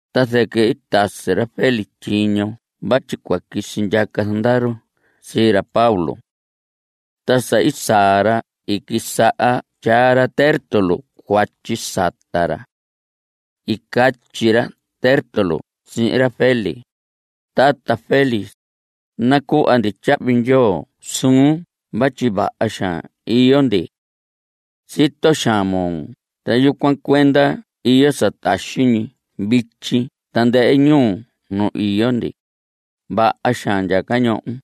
Ta zɨquɨ i tasi ra Félix tyiño vatyi cua quisi ndyaca zandaru sii ra Pablo. Ta sa i saa ra i quisaha tyaa ra Tértulo cuatyi sata ra. I catyi ra Tértulo sihin ra Félix: Tata Félix, nacuhva ndi tyahvi ndyoo suun vatyi vaha xaan iyo ndi. Sito xaan moo ta yucuan cuenda iyo sa taxi ñi vityi tandɨhɨ ñuu nu iyo ndi. Vaha xaan ndyaca ñohon.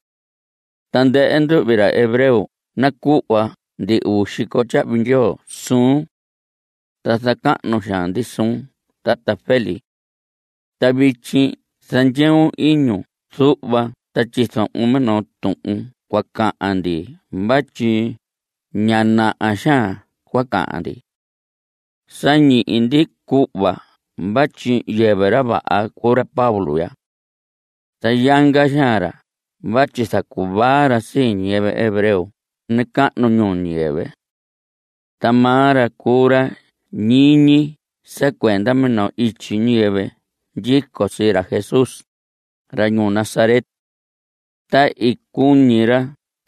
Tandɨhɨ nduhvi ra hebreo nacuhva ndi uu xico tyahvi ndyoo suun. Ta zacahnu xaan ndi suun tata Félix. Ta vityi zandyeun iñun zuhva ta tyizohon minoo tuhun cua cahan ndi vatyi ña naha xaan cua cahan ndi. Sa ñihi ndi cuhva vatyi yɨvɨ ra vaha cuu ra Pablo ya. Zayanga xaan ra vatyi zacuvaa ra sii ñiyɨvɨ hebreo nacahnu ñuu ñiyɨvɨ. Ta maa ra cuu ra ñiñi sa cuenda minoo ityi ñiyɨvɨ ndyico sii ra Jesús, ra ñuu Nazaret. Ta i cuñi ra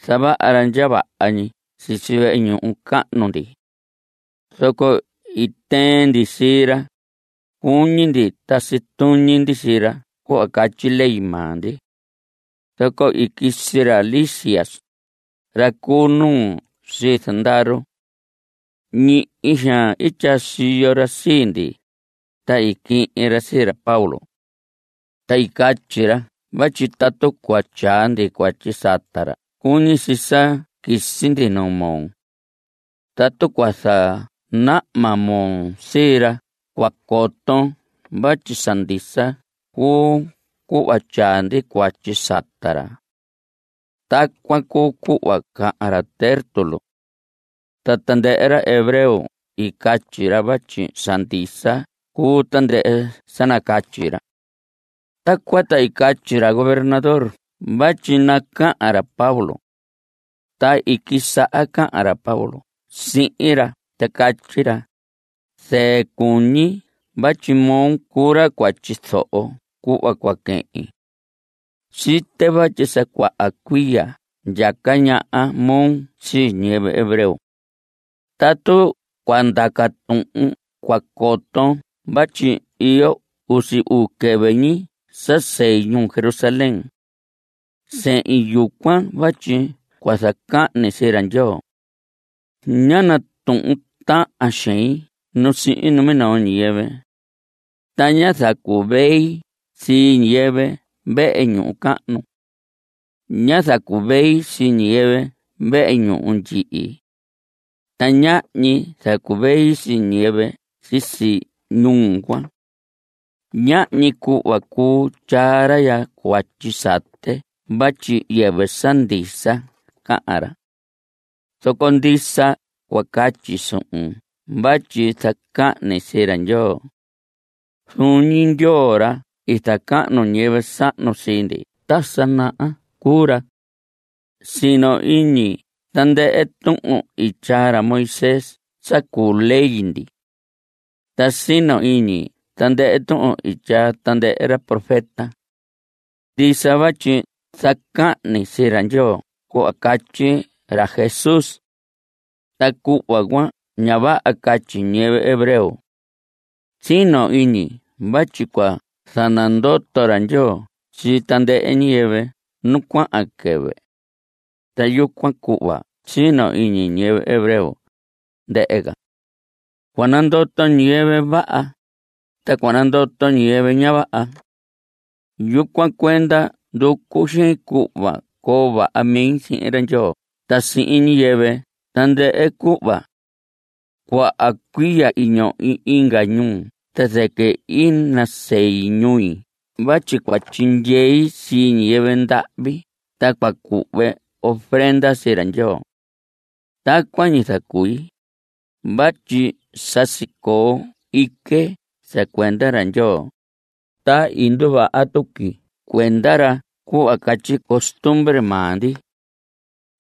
zavaha ra ndya vaha ñi sisi vehe ñuhu cahnu ndi. Zoco i tɨɨn ndi sii ra. Cuñi ndi tasi tuñi ndi sii ra cuhva catyi ley maa ndi. Zoco i quisi ra Lisias, ra cu nuu sii zandaru. Ñihi xaan i tyaa siyo ra sii ndi, ta i quihin ra sii ra Pablo. Ta i catyi ra vatyi tatu cua tyaa ndi cuatyi sata ra cuñi si sa quisi ndi nuu moo. Tatu cua zanahma moo sii ra cua coton vatyi sa ndisa cuu cuhva tyaa ndi cuatyi sata ra. Tacuan cuu cuhva cahan ra Tértulo. Ta tandɨhɨ ra hebreo i catyi ra vatyi sa ndisa cuu tandɨhɨ sa nacatyi ra. Tacuan ta i catyi ra gobernador vatyi nacahan ra Pablo. Ta i quisaha cahan ra Pablo sihin ra ta catyi ra: Zɨɨ cuñi vatyi moo cuu ra cua tyizoho cuhva cua quehin. Site vatyi sa cuaha cuiya ndyaca ñaha moo sii ñiyɨvɨ hebreo. Tatu cua ndaca tuhun cua coton vatyi iyo usi uu quɨvɨ ñi sa sei ñuu Jerusalén. Sehin yucuan vatyi cua zacahni sii ra Ndyoo. Ñá natuhun tahan xein nu sihin minoo ñiyɨvɨ. Ta ñá zacuvei sii ñiyɨvɨ vehe ñuhu cahnu. Ñá zacuvei sii ñiyɨvɨ vehe ñuhu ndyihi. Ta ñahñi zacuvei sii ñiyɨvɨ sisi ñuu cuan. Ñahñi cuhva cuu tyaa ra ya cuatyi sate vatyi yɨvɨ sa ndisa cahan ra. Zoco ndisa cua catyi suhun vatyi zacahni sii ra Ndyoo. Zuun ñi Ndyoo ra i zacahnu ñiyɨvɨ sahnu sii ndi ta sa naha cuu ra. Sino iñi tandɨhɨ tuhun i tyaa ra Moisés sa cuu ley ndi. Ta sino iñi tandɨhɨ tuhun i tyaa tandɨhɨ ra profeta. Ndisa vatyi zacahni sii ra Ndyoo cuhva catyi ra Jesús. Ta cuhva cuan ña vaha catyi ñiyɨvɨ hebreo. Sino iñi vatyi cua zanandoto ra Ndyoo sii tandɨhɨ ñiyɨvɨ nu cuahan quɨvɨ. Ta yucuan cuhva sino iñi ñiyɨvɨ hebreo, ndɨhɨ ca. Cua nandoto ñiyɨvɨ vaha, ta cua nandoto ñiyɨvɨ ña vaha. Yucuan cuenda nducu xein cuhva coo vaha mi sihin ra Ndyoo ta sihin ñiyɨvɨ tandɨhɨ cuhva. Cuaha cuiya i ñohi inga ñuu ta zɨquɨ i nasei ñui vatyi cua tyindyei sii ñiyɨvɨ ndahvi ta cua cuhve ofrenda sii ra Ndyoo. Tacuan ñi zacui, vatyi sa sicoo ique sa cuenda ra Ndyoo, ta i nduvaha tuqui cuenda ra cuhva catyi costumbre maa ndi.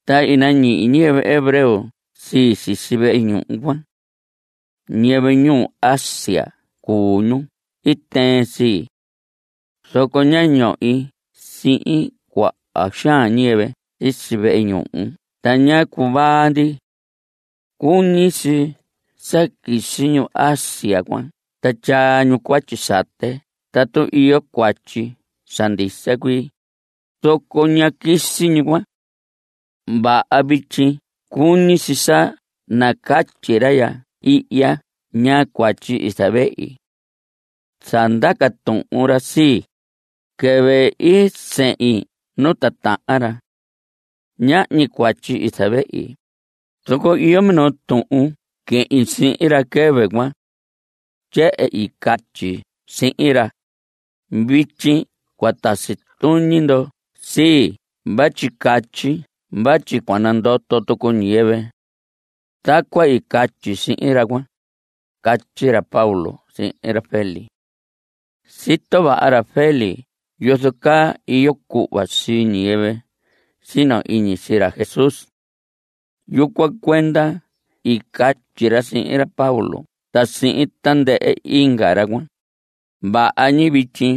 Ta i nañihi ñiyɨvɨ hebreo sii sisi vehe ñuhu cuan. Ñiyɨvɨ ñuu Asia cuu ñu i tɨɨn sii. Zoco ñá ñohi sihin cuaha xaan ñiyɨvɨ sisi vehe ñuhu ta ñá cuvaa ndi. Cuñi si sa quisi ñu Asia cuan ta tyaa ñu cuatyi sate tatu iyo cuatyi sa ndisa cuii. Zoco ñá quisi ñu cuan. Vaha, vityi cuñi si sa nacatyi ra ihya ñaa cuatyi i zavehi. Sa ndaca tuhun ra sii, quɨvɨ i sehin nu titahan ra. Ñahñi cuatyi i zavehi, zoco iyo minoo tuhun i quehin sihin ra quɨvɨ cuan. Tyehen i catyi sihin ra: “Vityi cua tasi tuñi ndo sii vatyi catyi vatyi cua nandoto tucu ñiyɨvɨ.” Tacuan i catyi sihin ra cuan, catyi ra Pablo sihin ra Félix. Sito vaha ra Félix yozo caa iyo cuhva sii ñiyɨvɨ sino iñi sii ra Jesús. Yucuan cuenda i catyi ra sihin ra Pablo ta sihin tandɨhɨ inga ra cuan: Vaha ñi vityi.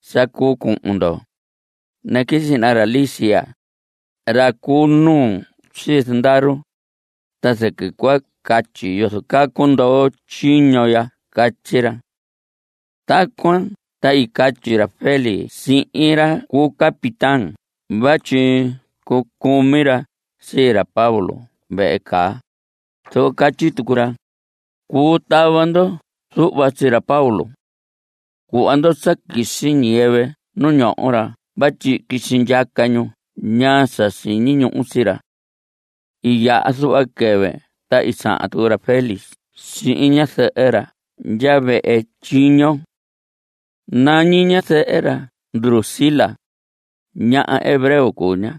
Sa cuu cuhun ndo. Naquisi xihna ra Lisias, ra cu nuu sii zandaru, ta zɨquɨ cua catyi yozo caa cundoo tyiño ya. Catyi ra. Tacuan ta i catyi ra Félix sihin ra cu capitán vatyi cucumi ra sii ra Pablo vehe caa, zoco catyi tucu ra: Cuu tava ndo zuhva sii ra Pablo. Cuhva ndo sa quisi ñiyɨvɨ nu ñoho ra vatyi quisi ndyaca ñu ñaa sa siñi ñuhu sii ra. I yaha zuhva quɨvɨ ta i sahan tucu ra Félix sihin ñazɨhɨ ra ndya vehe tyiño. Nañi ñazɨhɨ ra Drusila. Ñaha hebreo cuu ña.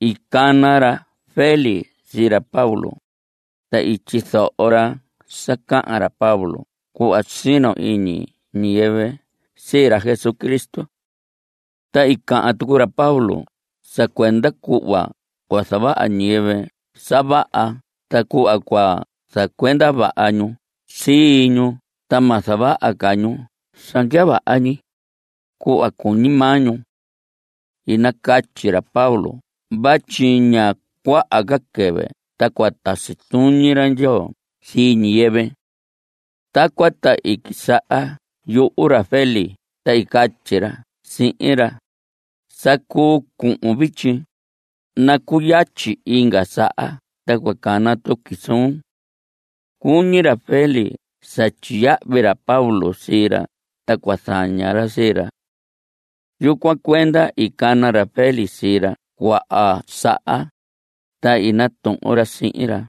I cana ra Félix sii ra Pablo. Ta i tyizoho ra sa cahan ra Pablo cuhva sino iñi ñiyɨvɨ sii ra Jesucristo. Ta i cahan tucu ra Pablo sa cuenda cuhva cua zavaha ñiyɨvɨ sa vaha ta cuhva cua zacuenda vaha ñu sii ñu ta ma zavaha ca ñu sa ndya vaha ñi, cuhva cuñi maa ñu. I nacatyi ra Pablo vatyi ña cuaha ca quɨvɨ ta cua tasi tuñi ra Ndyoo sii ñiyɨvɨ. Tacuan ta i quisaha yuhu ra Félix ta i catyi ra sihin ra: Sa cuu cuhun vityi. Nacuyatyi inga saha ta cua cana tuqui suun. Cuñi ra Félix sa tyiyahvi ra Pablo sii ra ta cua zaña ra sii ra. Yucuan cuenda i cana ra Félix sii ra cuaha saha. Ta i natuhun ra sihin ra.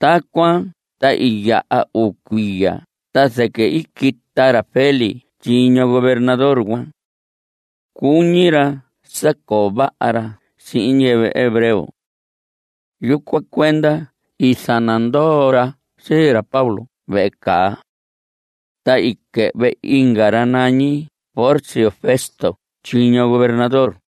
Tacuan ta i yaha uu cuiya ta zɨquɨ i quita ra Félix tyiño gobernador cuan. Cuñi ra sa coo vaha ra sihin ñiyɨvɨ hebreo. Yucuan cuenda i zanandoo ra sii ra Pablo vehe caa. Ta i quɨhvɨ inga ra nañi Porcio Festo tyiño gobernador.